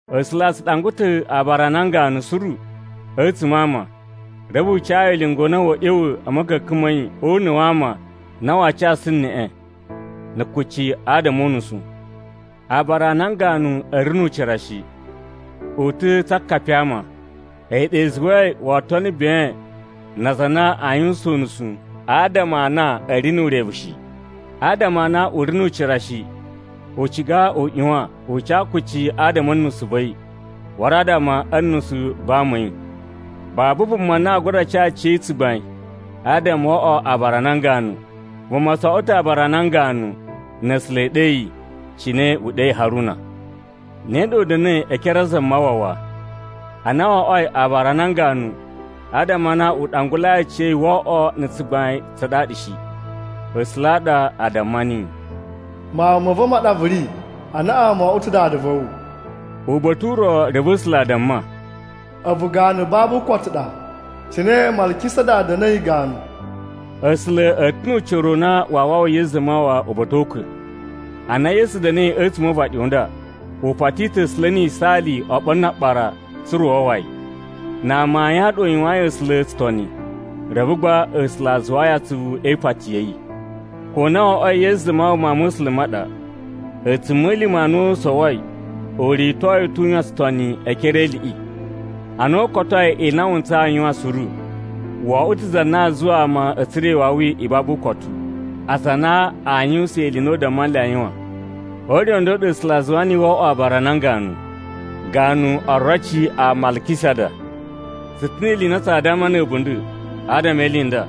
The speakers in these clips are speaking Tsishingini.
A̱sula̱ a tsu ɗangwa ta̱ aabara a nan ganu suru a̱tsuma̱ a ama, reve u ca yi ulinga u na wa̱a̱ ꞌya̱wa̱ a̱ ma̱ka̱ka̱n ma̱ yi o una̱ wa ama a na waa casu neꞌe na̱ kucci adama o unusu. Aabara a nan ganu a̱ ri nu ucira shi, u ta̱ tsa akapi a ama. A̱yi ɗa i zuwai woo tono ben na aza a na a yuwusan unusu adama a na a̱ ri nu urevu shi. Adama a na u ri nu ucira shi, u ciga u ꞌyuwan u ca kucci adama a̱ nusu va̱ yi waru adama a̱ nusu va ama a̱ yi. Babu vuma na aa gura ca aciya̱yi tsugbain adama wo oꞌwo aabara a nan ganu. Vuma tso oꞌwo ta̱ aabara a nan ganu na̱ A̱sula̱ e ɗe yi, cine u ɗeyi Haruna. Ne ɗa u da̱na̱i e ekere a Zamawawa. Ana wo oꞌwoi aabara a nan ganu, adama a na u ɗangulai aciya̱yi wo oꞌwo na̱ tsugbain tsa ɗaɗa shi. A̱sula̱ a ɗa a damma niyi, “Mawun ma̱ va̱ ma ɗa vu ri. Anaꞌan mo oꞌwo ta̱ Dada va̱ wu.” Uba̱ta̱ u ro reve A̱sula̱ a damma, “A̱vu ganu babu ukotu ɗa, cine Malkisada da̱na̱i ganu.” A̱sula̱ a̱ ta̱ nu ucira u na waa wawa Yesu Zamawawa uba̱ta̱ o ukwa̱. Ana Yesu da̱na̱i a̱tsuma̱ o uvaɗi u nda, u pati ta̱ A̱sula̱ ni yisaali oɓolo na aɓara tsa̱ra̱ u wawa yi. Na amayun a ɗa u yuwayin A̱sula̱ tsutoni, reve gba, A̱sula̱ a zuwaa yi atsuvu e ipati ya̱ yi. Ko na wo oꞌwoi Yesu Zamawawa Mawun ma̱ A̱sula̱ ma ɗa, a̱tsuma̱lima̱ a na u sowoi u rito yi ta̱ u yuwan tsutoni e ekere e iliꞌi. Ana u kotoi ili i na wu ntsayi u yuwan suru, wo oꞌwo ta̱ za na a zuwa ama a̱ tsura̱ iwawi i babu ukotu, aza a na a yuwusan ili i na u damma nle a yuwan. O ure u nda u ɗa A̱sula̱ a zuwa niyi wo oꞌwoi aabara a nan ganu, ganu oroci a Malkisada. Tsu ta̱ ni ili i na tsaa damma na̱ a̱bunda̱ adama e ili i nda,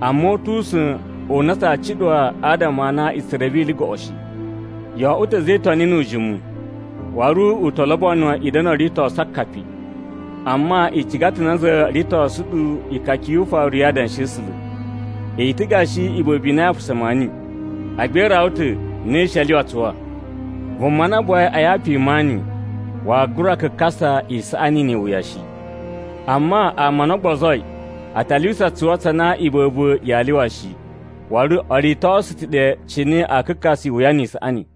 amma u tu usa̱n u na tsaa cuɗuwa adama a na i tsu reve ili goꞌo shi. Yo oꞌwo ta̱ a̱za̱ e Itoni nu ujimu, waru u to lobono i da̱na̱ o ritosu akapi. Amma i ciga ta̱ nanza ritosu ɗu ikaka yu ufaru ya adanshi a̱ A̱sula̱. I ta̱ gashi iba̱ba̱ i na ya apasa maani, agba i rawa ta̱ na i shi a lyuwa tsuwa. Vuma na buwai a yapu i maani waa gura kakasa isaꞌani ni iwuya shi. Amma ama a na o gbozoi a ta lyuwusa tsuwa tsa na iba̱ba̱ yaa lyuwa shi, waru o ritosu ta̱ ɗe cine aa kakasa iwuya ni isaꞌani.